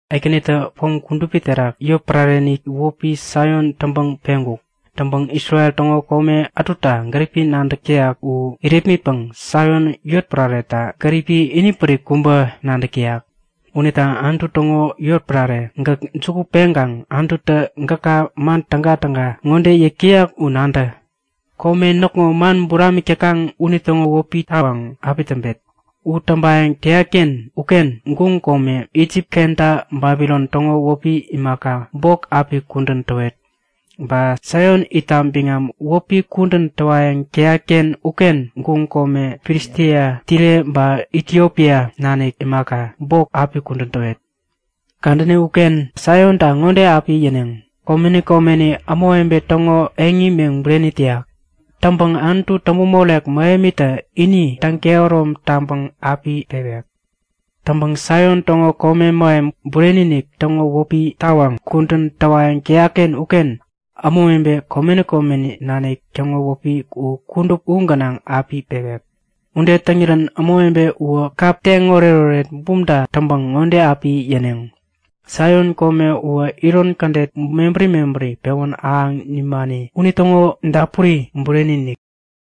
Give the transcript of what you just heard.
Ekänitä pom kudupi terak yotpärareni wäpi Saion täŋpäŋ peŋkuk. Täŋpäŋ Isrel täŋo kome ätuta gäripi nadäk täyak u irepmitpäŋ Saion yotpärareta gäripi ini pärik kubä nadäk täyak. Unita Anutu täŋo yotpärare, gäk juku peŋkaŋ Anututä gäka man tägatäga ŋode yäyak u nadä; Kome näkŋo man buramik täkaŋ unitäŋo wäpi tawaŋ api täŋpet. U täŋpayäŋ täyatken uken guŋ kome, Isip kenta Babilon täŋo wäpi imaka, bok api kudän täwet. Ba Saion itta biŋam wäpi kudän täwayäŋ täyatken uken guŋ kome Filistia, Tire ba Itiopia nanik imaka, bok api kudän täwet. Kadäni uken Saionta ŋode api yäneŋ; Komeni komeni ämawebe täŋo eŋi meŋ bureni täyak. Täŋpäŋ Anutu täŋpämorek mähemitä ini täŋ-kehärom taŋpäŋ api pewek. Täŋpäŋ Saion täŋo kome mähem bureni-inik täŋo wäpi tawaŋ kudän täwayäŋ täyakken uken ämawebe komeni komeni nanik täŋo wäpi u kudup u gänaŋ api pewek. Ude täŋirän ämawebe uwä kap teŋ oretoret bumta täŋpäŋ ŋode api yäneŋ; Saion kome ŋowä iron kädet mebäri mebäri pewä ahäŋ nimani unitäŋo dapuri bureni-inik!